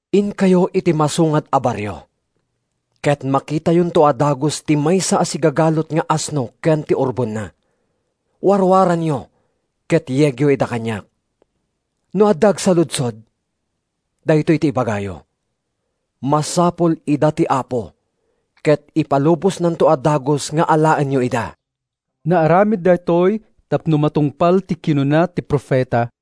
“Inkayo iti masungad a barrio, ket makitayonto a dagus ti maysa a sigagalut nga asno ken ti urbonna. Warwaranyo ket yegyo ida kaniak. No adda agsaludsod, daytoy ti ibagayo, ‘Masapul ida ti Apo’ ket ipalubosnanto a dagus nga alaenyo ida.” Naaramid daytoy tapno matungpal ti kinuna ti profeta: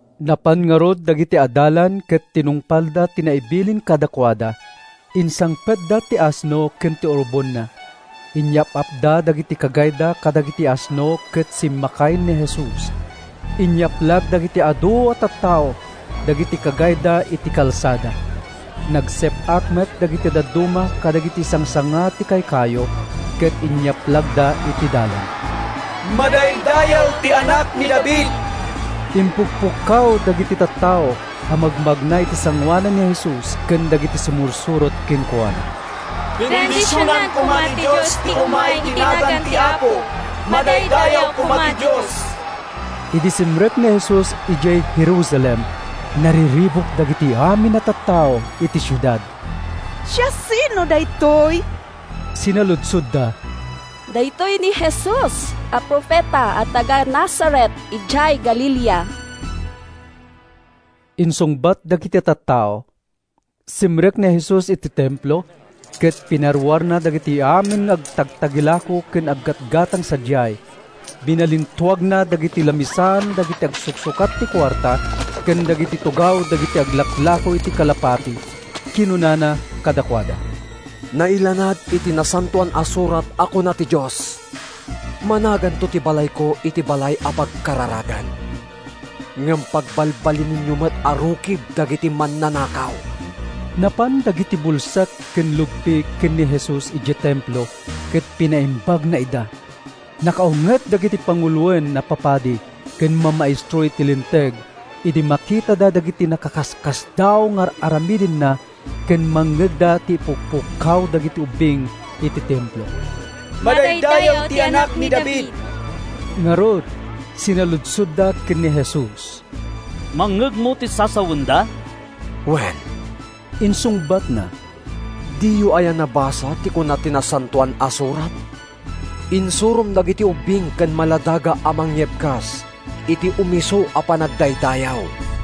Napan ngarud dagiti adalan ket tinungpalda ti naibilin kadakuada. Insangpetda ti asno ken ti urbonna. Inyap-apda dagiti kagayda kadagiti asno ket simmakay ni Jesus. Inyaplag dagiti adu a tattao dagiti kagayda iti kalsada. Nagsep-ak met dagiti dadduma kadagiti sangsanga ti kaykayo ket inyaplagda iti dalan. “Madaydayaw ti Anak ni David!” impukpukkaw dagiti tattao a magmagna iti sangoanan ni Jesus ken dagiti sumursurot kenkuana. “Bendisionan koma ti Dios ti umay iti nagan ti Apo! Madaydayaw koma ti Dios!” Idi simrek ni Jesus idiay Jerusalem, nariribuk dagiti amin a tattao iti siudad. “Siasino daytoy?” sinaludsodda. “Daytoy ni Jesus a profeta a taga-Nazaret idiay Galilea,” insungbat dagiti tattao. Simrek ni Jesus iti Templo ket pinaruarna dagiti amin nga agtagtagilako ken aggatgatang sadiay. Binalintuagna dagiti lamisaan dagiti agsuksukat iti kuarta ken dagiti tugaw dagiti aglaklako iti kalapati. Kinunana kadakuada, “Nailanad iti Nasantoan a Surat a kuna ti Dios, ‘Managanto ti balayko iti balay a pagkararagan.’ Ngem pagbalbalinenyo met a rukib dagiti mannanakaw!” Napan dagiti bulsek ken lugpi ken ni Jesus idiay Templo ket pinaimbagna ida. Nakaunget dagiti panguloen a papadi ken mamaestro iti Linteg idi makitada dagiti nakaskasdaaw nga ar-aramidenna ken mangngegda ti ipukpukkaw dagiti ubbing iti Templo, “Madaydayaw ti Anak ni David!” Ngarud, sinaludsodda ken ni Jesus, “Mangngegmo ti sasawenda?” “Wen,” insungbatna. “Diyo aya nabasa ti kuna ti Nasantoan a Surat? ‘Insurom dagiti ubbing ken maladaga a mangyebkas iti umisu a panagdaydayaw.’”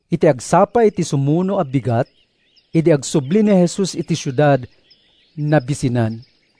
Iti agsapa iti sumuno a bigat, idi agsubli ni Jesus iti siudad, nabisinan.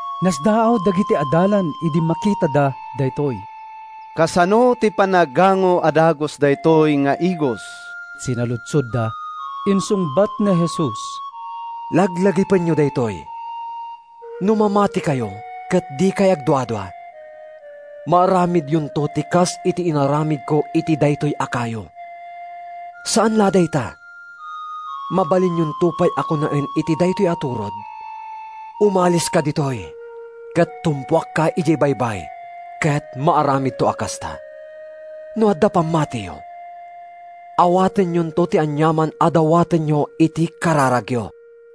Nasdaaw dagiti adalan idi makitada daytoy. “Kasano ti panaggango a dagus daytoy nga igos?” sinaludsodda. Insungbat ni Jesus, “Laglagipenyo daytoy! No mamatikayo ket dikay agduadua, maaramidyonto ti kas iti inaramidko iti daytoy a kayo. Saan la a dayta. Mabalinyonto pay a kunaen iti daytoy a turod, ‘Umaliska ditoy ket tumpuakka idiay baybay,’ ket maaramidto a kasta. No adda pammatiyo, awatenyonto ti aniaman a dawatenyo iti kararagyo.”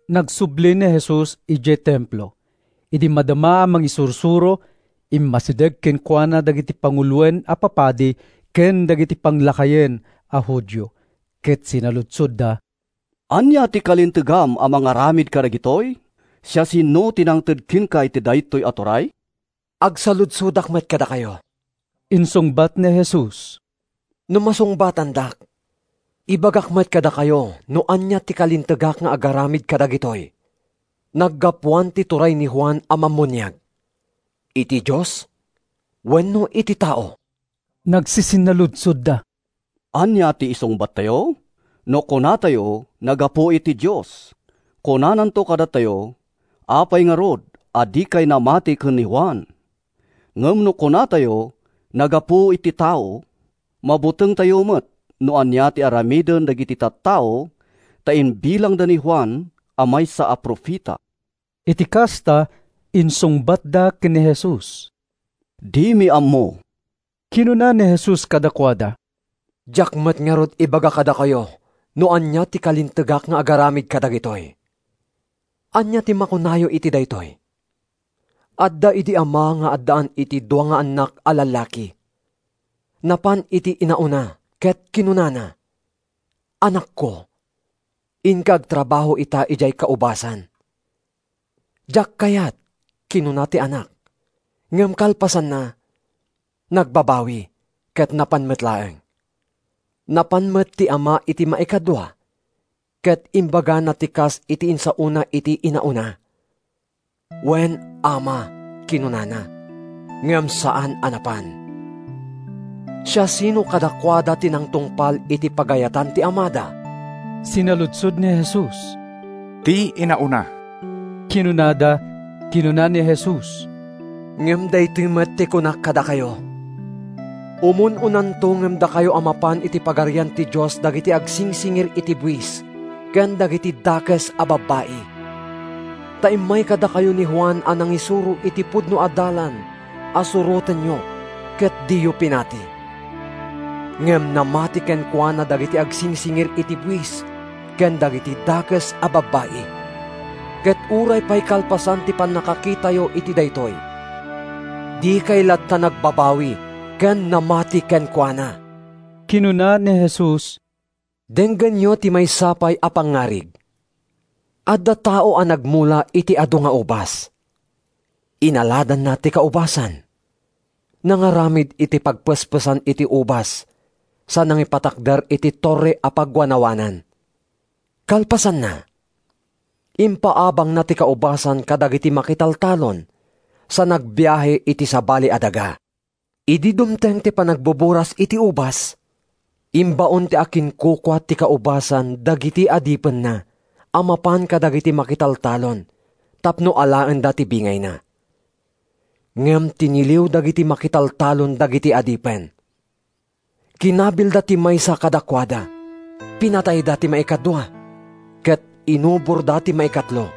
Nagsubli ni Jesus idiay Templo. Idi madama a mangisursuro, immasideg kenkuana dagiti panguloen a papadi ken dagiti panglakayen a Judio, ket sinaludsodda, “Ania ti kalintegam a mangaramid kadagitoy? Siasino ti nangted kenka iti daytoy a turay?” “Agsaludsodak met kadakayo,” insungbat ni Jesus. “No masungbatandak, ibagak met kadakayo no ania ti kalintegak nga agaramid kadagitoy. Naggapuan ti turay ni Juan a Mammuniag: iti Dios wenno iti tao?” Nagsisinnaludsodda, “Ania ti isungbattayo? No kunatayo, ‘Naggapu iti Dios,’ kunananto kadatayo, ‘Apay ngarud a dikay namati ken ni Juan?’ Ngem no kunatayo, ‘Naggapu iti tao,’ mabutengtayo met no ania ti aramiden dagiti tattao ta imbilangda ni Juan a maysa a profeta.” Iti kasta, insungbatda ken ni Jesus, “Dimi ammo.” Kinuna ni Jesus kadakuada, “Diak met ngarud ibaga kadakayo no ania ti kalintegak nga agaramid kadagitoy.” “Ania ti makunayo iti daytoy? Adda idi ama nga addaan iti dua nga annak a lallaki. Napan iti inauna ket kinunana, ‘Anakko, inka agtrabaho ita idiay kaubasan.’ “‘Diak kayat,’ kinuna ti anak, ngem kalpasanna, nagbabawi ket napan met laeng. “Napan met ti ama iti maikadua ket imbagana ti kas iti insaona iti inauna. “ ‘Wen, ama,’ kinunana, ngem saan a napan. “Siasino kadakuada ti nangtungpal iti pagayatan ti amada?” sinaludsod ni Jesus. “Ti inauna,” kinunada. Kinuna ni Jesus, “Ngem daytoy met ti kunak kadakayo. “Umun-unanto ngem dakayo a mapan iti Pagarian ti Dios dagiti agsingsingir iti buis ken dagiti dakes a babbai. Ta immay kadakayo ni Juan a nangisuro iti pudno a dalan a surotenyo ket diyo pinati; ngem namati kenkuana dagiti agsingsingir iti buis ken dagiti dakes a babbai. Ket uray pay kalpasan ti pannakakitayo iti daytoy, dikay latta nagbabawi ken namati kenkuana.” Kinuna ni Jesus, “Denggenyo ti maysa pay a pangngarig: Adda tao a nagmula iti adu nga ubas. Inaladanna ti kaubasan, nangaramid iti pagpespesan iti ubas sa nangipatakder iti torre a pagwanawanan. Kalpasanna, impaabangna ti kaubasan kadagiti makitaltalon sa nagbiahe iti sabali a daga. “Idi dumteng ti panagbuburas iti ubas, imbaon ti akinkukua iti kaubasan dagiti adipennaa mapan kadagiti makitaltalon tapno alaenda ti bingayna. Ngem tiniliw dagiti makitaltalon dagiti adipen. Kinabilda ti maysa kadakuada, pinatayda ti maikadua ket inuborda ti maikatlo.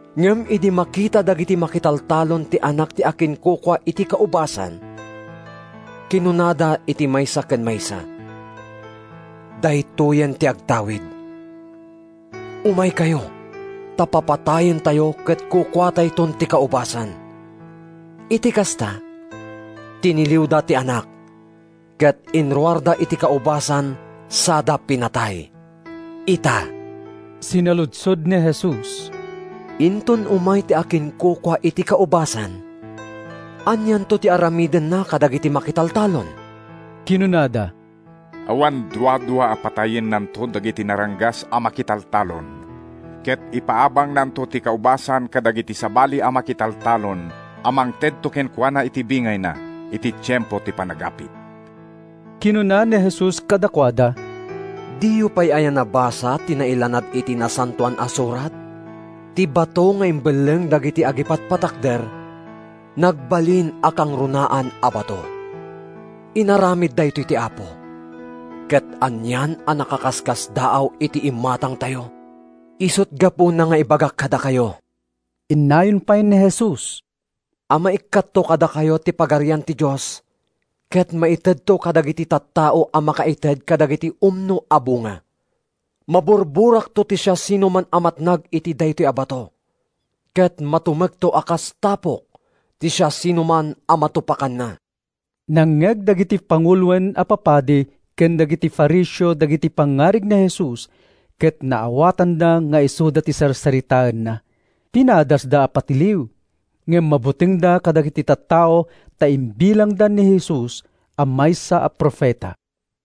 “Ngem idi makita dagiti makitaltalon ti anak ti akinkukua iti kaubasan, kinunada iti maysa ken maysa, ‘Daytoyen ti agtawid! Umaykayo ta papatayentayo ket kukuatayton ti kaubasan!’ “Iti kasta, tiniliwda ti anak, ket inruarda iti kaubasan sada pinatay. “Ita,” sinaludsod ni Jesus, “inton umay ti akinkukua iti kaubasan, anianto ti aramidenna kadagiti makitaltalon?” Kinunada, “Awan duadua a patayennanto dagiti naranggas a makitaltalon. Ket ipaabangnanto ti kaubasan kadagiti sabali a makitaltalon a mangtedto kenkuana iti bingayna iti tiempo ti panagapit.” Kinuna ni Jesus kadakuada, “Diyo pay aya nabasa ti nailanad iti Nasantoan a Surat? ‘Ti bato nga imbelleng dagiti agipatpatakder, Nagbalin a kangrunaan a bato. Inaramid daytoy ti Apo, Ket anian a nakakaskasdaaw iti imatangtayo!’ “Isut’ gapuna nga ibagak kadakayo,” innayon pay ni Jesus, “a maikkatto kadakayo ti Pagarian ti Dios ket maitedto kadagiti tattao a makaited kadagiti umno a bunga. Maburburakto ti siasinoman a matnag iti daytoy a bato, ket matumekto a kas tapok ti siasinoman a matupakanna.” Nangngeg dagiti panguloen a papadi ken dagiti Fariseo dagiti pangngarig ni Jesus ket naawatanda nga isuda ti sarsaritaenna. Pinadasda a patiliw, ngem mabutengda kadagiti tattao ta imbilangda ni Jesus a maysa a profeta.